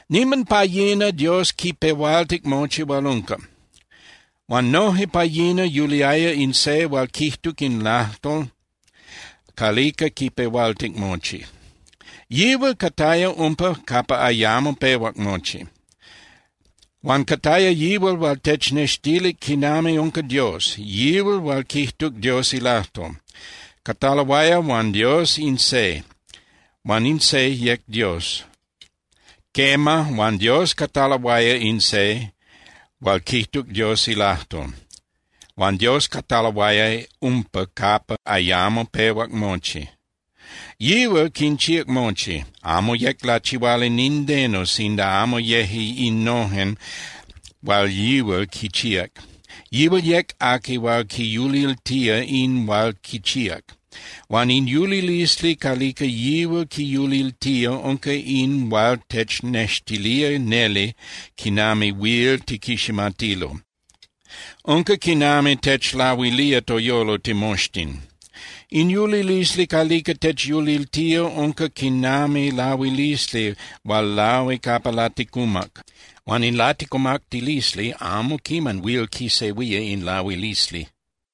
Niman pa yina Dios quipehualtic mochi hual unca. Huan noje pa yina yuliaya in Se hual quijtuc in lajtol calica quipehualtic mochi. Yihual cataya umpa capa ayamo pehuac mochi. Huan cataya yihual hual technextilic quinami unca Dios, yihual hual quijtuc Dios ilajtol. Cataloaya huan Dios in Se, huan in Se yec Dios. Quema, huan Dios cataloaya in Se hual quijtuc Dios ilajtol, huan Dios cataloaya umpa capa ayamo pehuac mochi. Yihual quinchíac mochi, amo yec lachihuali nindeno sinda amo yeje innojen hual yihual quinchíac. Yihual yec aqui hual quiyuliltía in hual quichíac. Huan in yulilisli calica yihual quiyuliltía unca in hual technextilía neli quinami huil tiquiximatilo, unca quinami techlahuilía toyolo timoxtin. In yulilisli calica techyuliltía unca quinami lahuilisli hual lahui capa laticumac. Huan in laticumactilisli amo quiman huil quisehuía in lahuilisli.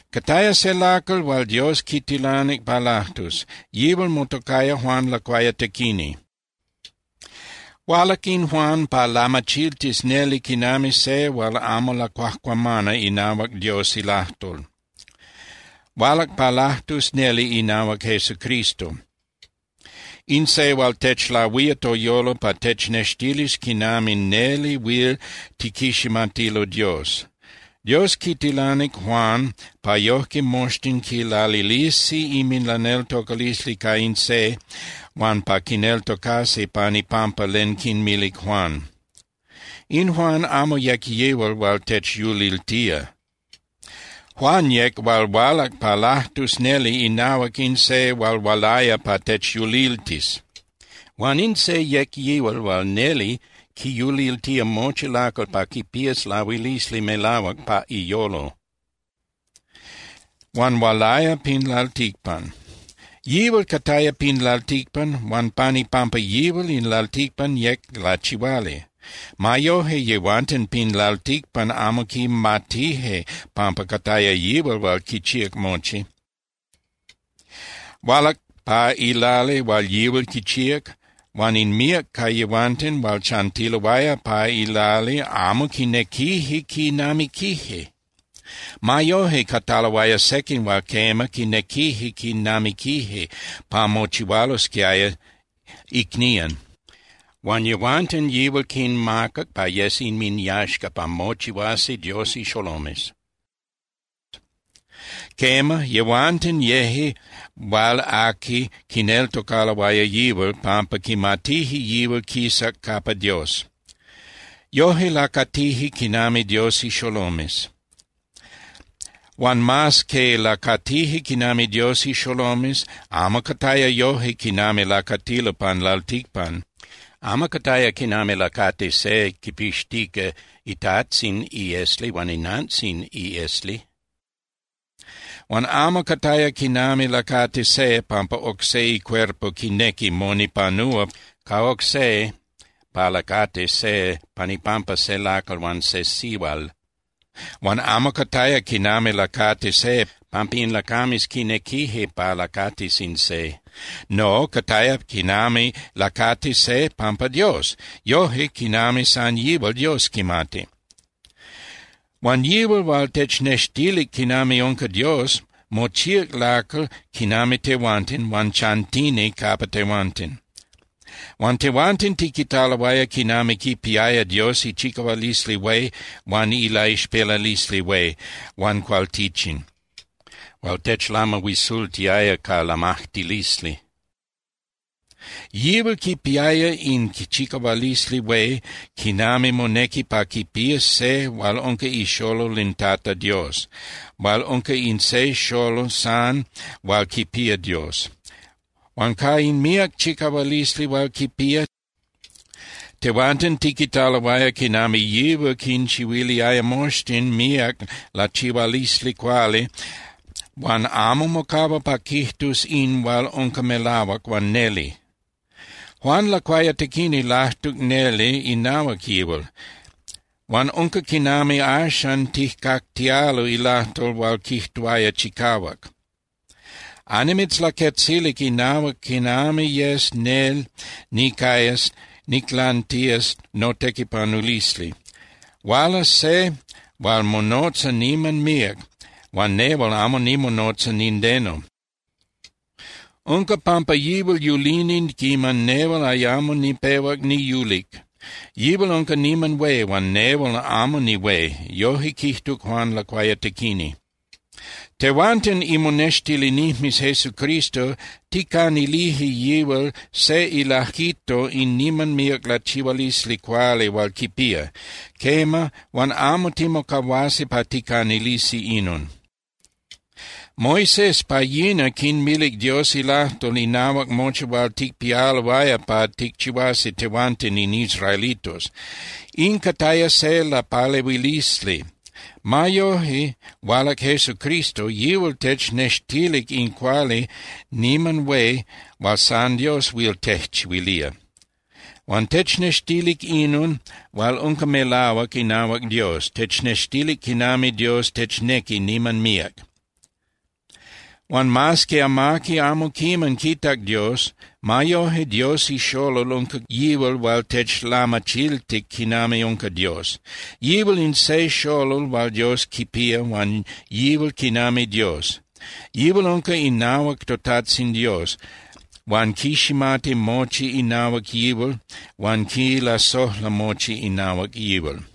Cataya se lacal hual Dios quitilanic pa lajtus. Yihual motocaya Juan Lacuayatequini. Hualac in Juan pa lamachiltis neli quinami se hual amo lacuajcuamana inahuac Dios ilajtol. Hualac pa lajtus neli inahuac Jesucristo, in Se hual techlahuía toyolo pa technextilis quinami neli huil tiquiximatilo Dios. Dios quitilanic Juan pa yojque moxtin quilalilisi inminlaneltocalisli ca in Se huan pa quineltocasi pan ipampa len quinmilic Juan. In Juan amo yec yihual hual techyuliltía. Juan yec hual hualac pa lajtus neli inahuac in se hual hualaya pa techyuliltis. Huan in se yec yihual hual neli quiyuliltía mochi lacal pa quipías lahuilisli melahuac pa iyolo. Huan hualaya pin lalticpan. Yihual cataya pin lalticpan, huan pan ipampa yihual in lalticpan yec lachihuali. Ma yoje, yehuanten pin lalticpan amo quimatije pampa cataya yihual hual quichíac mochi. Hualac pa ilali hual yihual quichíac huan in míac ca yehuanten hual chantiloaya pa ilali amo quinequije quinamiquije. Ma yoje, cataloaya sequin hual quema, quinequije quinamiquije pa mochihualosquiaya icnían. Huan yehuanten yihual quinmacac pa yes inminyaxca pa mochihuasi Dios ixolomes. Quema, yehuanten yeje hual aqui quineltocaloaya yihual pampa quimatije yihual quisac capa Dios. Yoje lacatije quinami Dios ixolomes. Huan mas que lacatije quinami Dios ixolomes, amo cataya yoje quinami lacatilo pan lalticpan. Amo cataya quinami lacati se quipixtica itajtzin iesli huan inantzin iesli. Huan amo cataya quinami lacati se pampa oc se icuerpo quinequi monipanúa ca oc se pa lacatis se pan ipampa se lacal huan se sihual. Huan amo cataya quinami lacati se pampa in lacames quinequije pa lacatis in se. No, cataya quinami lacati se pampa Dios, yoje quinami san yihual Dios quimati. Huan yihual hual technextilic quinami unca Dios mochíac lacal quinami tehuanten huan chantini capa tehuanten. Huan tehuanten tiquitaloaya quinami quipiaya Dios ichicahualisli hué huan ilaixpelalisli hué huan cualtichin hual techlamahuisultiaya ca lamajtilisli. Yihual quipiaya in chicahualisli hué quinami monequi pa quipías se hual unca ixolol in Tata Dios, hual unca in se xolol san hual quipía Dios. Huan ca in míac chicahualisli hual quipía, tehuanten tiquitaloaya quinami yihual quinchihuiliaya moxtin míac lachihualisli cuali huan amo mocahua pa quijtus in hual unca melahuac huan neli. Juan Lacuayatequini lajtuc neli inahuac yihual, huan unca quinami axan tijcactialo ilajtol hual quijtuaya chicahuac: —Annimitzlaquetzilic inahuac quiman yes nel nicayas niclantías notequipanulisli. Hualas se hual monotza niman míac huan nehual amo nimonotza nindeno. Unca pampa yihual yulini quiman nehual ayamo nipehuac niyulic. Yihual unca niman hué huan nehual amo nihué —yoje quijtuc Juan Lacuayatequini. Tehuanten imonextilinijmes Jesucristo ticanilije yihual se ilajquito in niman míac lachihualisli cuali hual quipía. Quema, huan amo timocahuasi pa ticanilisi inon. Moisés pa yina quinmilic Dios ilajtol inahuac mochi hual ticpialoaya pa ticchihuasi tehuanten in israelitos. In cataya se lapalehuilisli. Ma yoje, hualac Jesucristo, yihual technextilic in cuali niman hué hual san Dios huil tejchihuilía. Huan technextilic inon hual unca melahuac inahuac Dios, technextilic quinami Dios technequi niman míac. Huan mas que amaqui amo quiman quitac Dios, ma yoje Dios ixolol unca yihual hual techlamachiltic quinami unca Dios. Yihual in se xolol hual Dios quipía huan yihual quinami Dios. Yihual unca inahuac totajtzin Dios, huan quiximati mochi inahuac yihual huan quilasojla mochi inahuac yihual.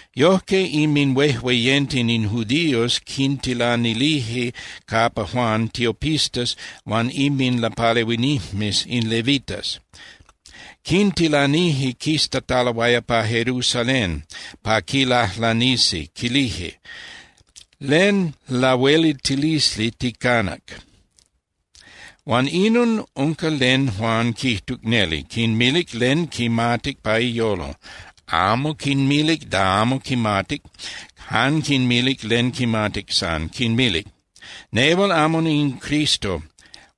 Yojque inminhuejueyenten in judíos quintilanilije capa Juan tiopistas huan inminlapalehuinijmes in levitas. Quintilanije quistataloaya pa Jerusalén pa quilajlanisi, quilije: —¿Len lahueliltilisli ticanac? Huan inon unca len Juan quijtuc neli, quinmilic len quimatic pa iyolo. Amo quinmilic da amo quimatic, jan quinmilic len quimatic san, quinmilic: —Nehual amo in Cristo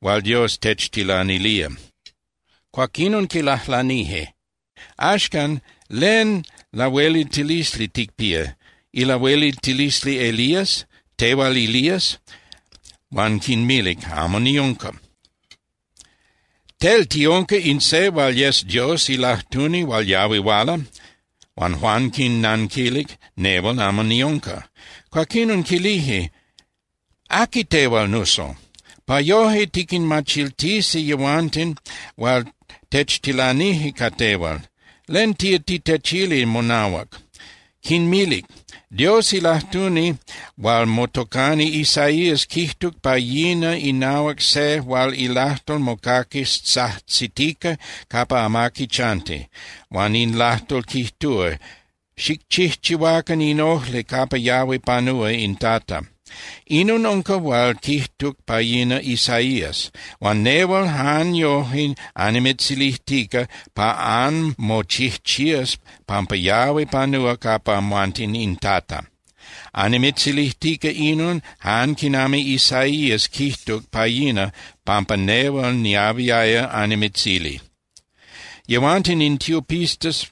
hual Dios techtilanilía. Cuaquinon quilajlanije: —Axcan, ¿len lahueliltilisli ticpía? ¿Ilahueliltilisli Elías? ¿Tehual Elías? Huan quinmilic: —Amo niunca. Tel ¿tiunca in se hual yes Dios ilajtuni hual yahui huala? Huan Juan quinnanquilic: —Nehual amo niunca. Cuaquinon quilije: —¿Aqui tehual, nuso? Pa yoje tiquinmachiltisi yehuanten hual techtilanije ca tehual. ¿Len tía titechili monahuac? Quinmilic: —Dios ilajtuni hual motocani Isaías quijtuc pa yina inahuac se hual ilajtol mocaquis tzajtzitica capa amaqui chanti, huan in lajtol quijtúa: “Xicchijchihuacan in ojli capa yahui panúa in Tata.” Inon unca hual quijtuc pa yina Isaías. Huan nehual jan yoje annimitzilijtica pa anmochijchías pampa yahui panúa capa amhuanten in Tata. Annimitzilijtica inon jan quinami Isaías quijtuc pa yina pampa nehual niahuiaya annimitzili. Yehuanten in tiopistas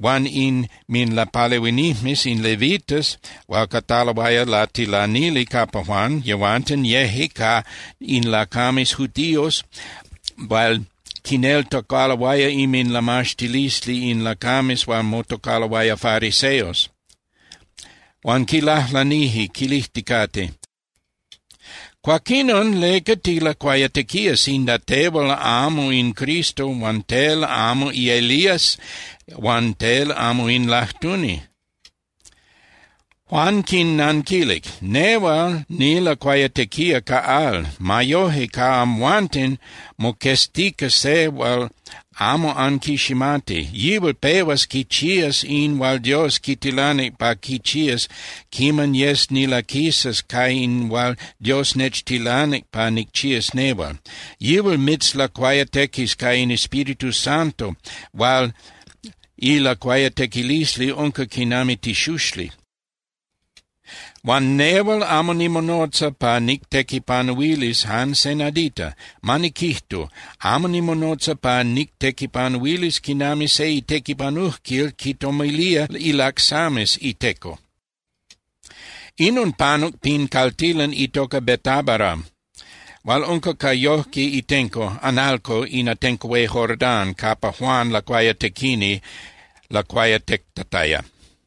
huan inminlapalehuinijmes in levitas hual cataloaya latilanili capa Juan, yehuanten yeje ca in lacames judíos hual quineltocaloaya inminlamaxtilisli in lacames hual motocaloaya fariseos. Huan quilajlanije quilijticate: —Cuaquinon, ¿leca tilacuayatequía sinda tehual amo in Cristo huan tel amo Elías huan tel amo in lajtuni? Juan quinnanquilic: —Nehual nilacuayatequía ca al. Ma yoje, ca amhuanten moqueztica se hual amo anquiximati. Yihual pehuas quichías in hual Dios quitilanic pa quichías quiman yes nilaquisas ca in hual Dios nechtilanic pa nicchías nehual. Yihual anmitzlacuayatequis ca in Espíritu Santo hual ilacuayatequilisli unca quinami tixuxli. Huan nehual amo nimonotza pa nictequipanuilis jan se nadita, ma niquijtu, amo nimonotza pa nictequipanuilis quinami se itequipanujquil quitomilía ilacsames iteco. Inon panuc pin caltilan itoca Betábara hual unca ca yojque itenco (analco) in atenco hué Jordán capa Juan Lacuayatequini lacuayatectataya.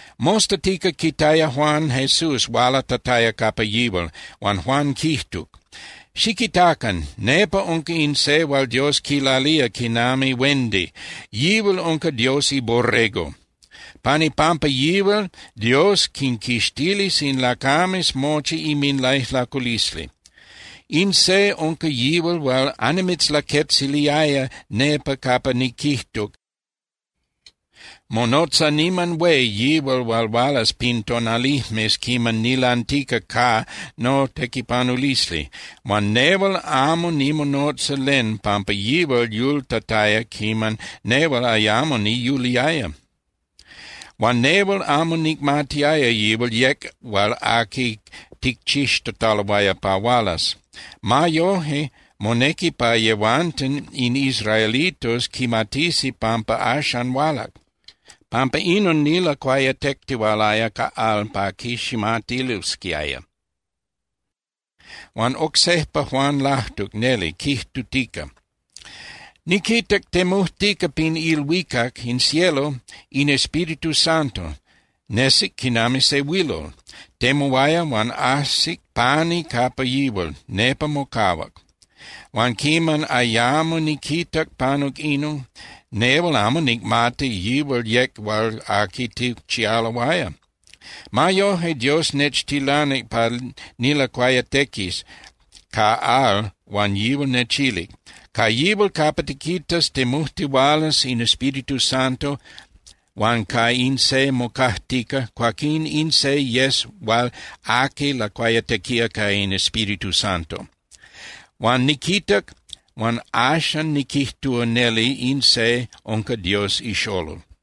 Mostatica quitaya Juan Jesús hualatataya capa yihual, huan Juan quijtuc: —Xiquitacan. Nepa unca in se hual Dios quilalía quinami huendi, yihual unca Dios iBorrego. Pan ipampa yihual Dios quinquixtilis in lacames mochi inminlaijlaculisli. In se unca yihual hual annimitzlaquetziliaya nepa capa niquijtuc: “Monotza niman hué yihual hual hualas pin tonalijmes quiman nilantica ca notequipanulisli. Huan nehual amo nimonotza len pampa yihual yultataya quiman nehual ayamo niyuliaya.” Huan nehual amo nicmatiaya yihual yec hual aqui ticchixtataloaya pa hualas. Ma yoje monequi pa yehuanten in israelitos quimatisi pampa axan hualac. Pampa inon nilacuayatectihualaya ca al pa quiximatilosquiaya. Huan oc sejpa Juan lajtuc neli, quijtutica: —Niquitac temujtica pin ilhuicac (in cielo) in Espíritu Santo, nesic quinami se huilol. Temuaya huan ajsic pani capa yihual, nepa mocahuac. Huan quiman ayamo niquitac panuc inon, nehual amo nicmatic yihual yec hual aqui ticchialoaya. Ma yoje, Dios nechtilanic pa nilacuayatequis ca al huan yihual nechilic: “Ca yihual capa tiquitas temujtihualas in Espíritu Santo huan ca in se mocajtica, cuaquín in se yes hual aqui lacuayatequía ca in Espíritu Santo.” Huan niquitac huan axan niquijtúa neli in se unca Dios iXolol.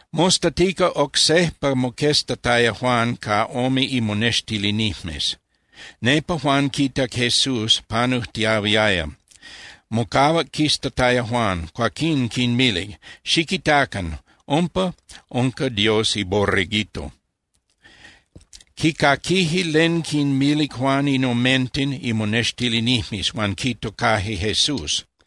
Mostatica oc sejpa moqueztataya Juan ca ome imonextilinijmes. Nepa Juan quitac Jesús panujtiahuiaya. Mocahuac quiztataya Juan, cuaquín quinmilic: —Xiquitacan. Umpa unca Dios iBorreguito. Quicaquije len quinmilic Juan in omenten imonextilinijmes huan quitocaje Jesús.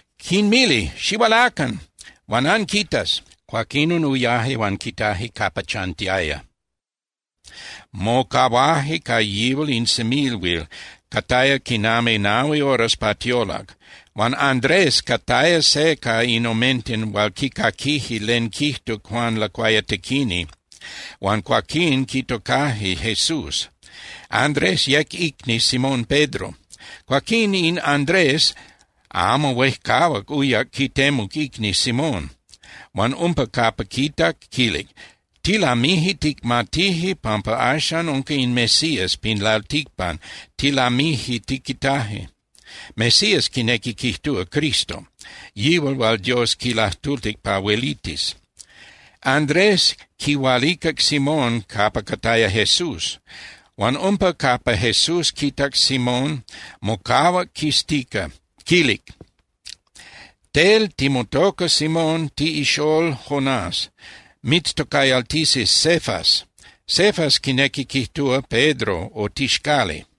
Quinmilic: —Xihualacan huan anquitas. Cuaquinon uyaje huan quitaje capa chantiaya, mocahuaje ca yihual in semilhuil, cataya quinami nahui horas pa tiolac. Huan Andrés cataya se ca in omenten hual quicaquije len quijtuc Juan Lacuayatequini huan cuaquín quitocaje Jesús. Andrés yec icni Simón Pedro. Cuaquín, in Andrés amo huejcahuac uyac quitemuc icni Simón huan umpa capa quitac, quilic: —Tilamije ticmatije pampa axan unca in Mesías pin lalticpan, tilamije tiquitaje. (Mesías quinequi quijtúa Cristo, yihual hual Dios quilajtultic pa huelitis.) Andrés quihualicac Simón capa cataya Jesús. Huan umpa capa Jesús quitac Simón, mocahuac quiztica, quilic: —Tel timotoca Simón tiꞌixól Jonás. Mitztocayaltisi Cefas. (Cefas quinequi quijtúa Pedro o tixcali.)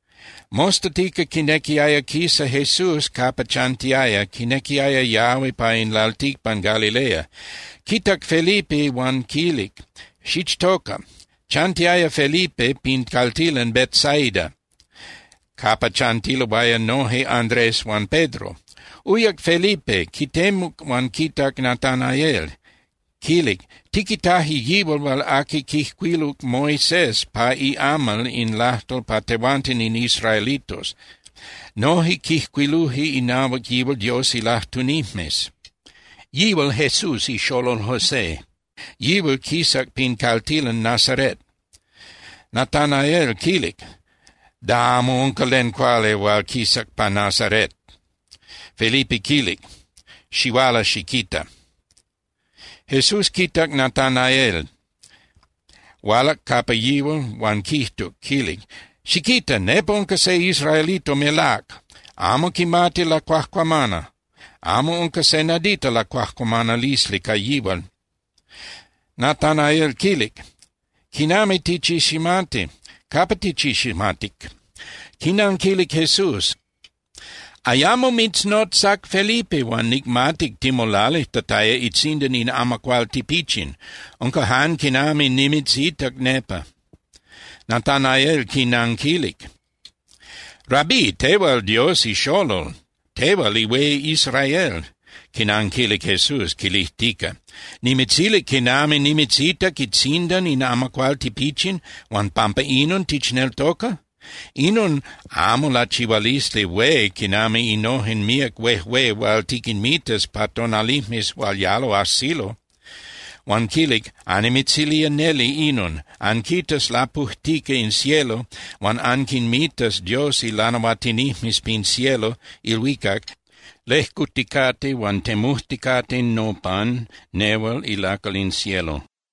Mostatica quinequiaya quisa Jesús capa chantiaya, quinequiaya yahui pa in lalticpan Galilea. Quitac Felipe huan quilic: —Xichtoca. Chantiaya Felipe pin caltilan Betsaida, capa chantiloaya noje Andrés huan Pedro. Uyac Felipe, quitemuc huan quitac Natanaél, quilic: —Tiquitaje yihual hual aqui quijcuiluc Moisés pa iamal in lajtol pa tehuanten in israelitos, noje quijcuiluje inahuac yihual Dios ilajtunijmes. Yihual Jesús ixolol José, yihual quisac pin caltilan Nazaret. Natanaél quilic: —Da amo unca len cuali hual quisac pa Nazaret. Felipe quilic: —Xihuala xiquita. Jesús quitac Natanaél hualac capa yihual, huan quijtuc, quilic: —Xiquita. Nepa unca se israelito melác. Amo quimati lacuajcuamana, amo unca se nadita lacuajcuamanalisli ca yihual. Natanaél quilic: —¿Quinami tichiximati? ¿Capa tichiximatic? Quinanquilic Jesús: —Ayamo mitznotzac Felipe huan nicmatic timolalijtataya itzindan in amacuál tipichin. Unca jan quinami nimitzitac nepa. Natanaél quinanquilic: —Rabí, tehual Dios iXolol, tehual ihué Israel. Quinanquilic Jesús quilijtica: —Nimitzilic quinami nimitzitac itzindan in amacuál tipichin, huan ¿pampa inon tichneltoca? Inon amo lachihualisli hué quinami innojen míac huéjue hual tiquinmitas pa tonalijmes hual yalo ajsilo. Huan quilic: —Annimitzilía neli inon. Anquitas lapujtica in cielo huan anquinmitas Dios ilanahuatinijmes pin cielo (ilhuicac) lejcuticate huan temujticate nopan nehual ilacal in cielo.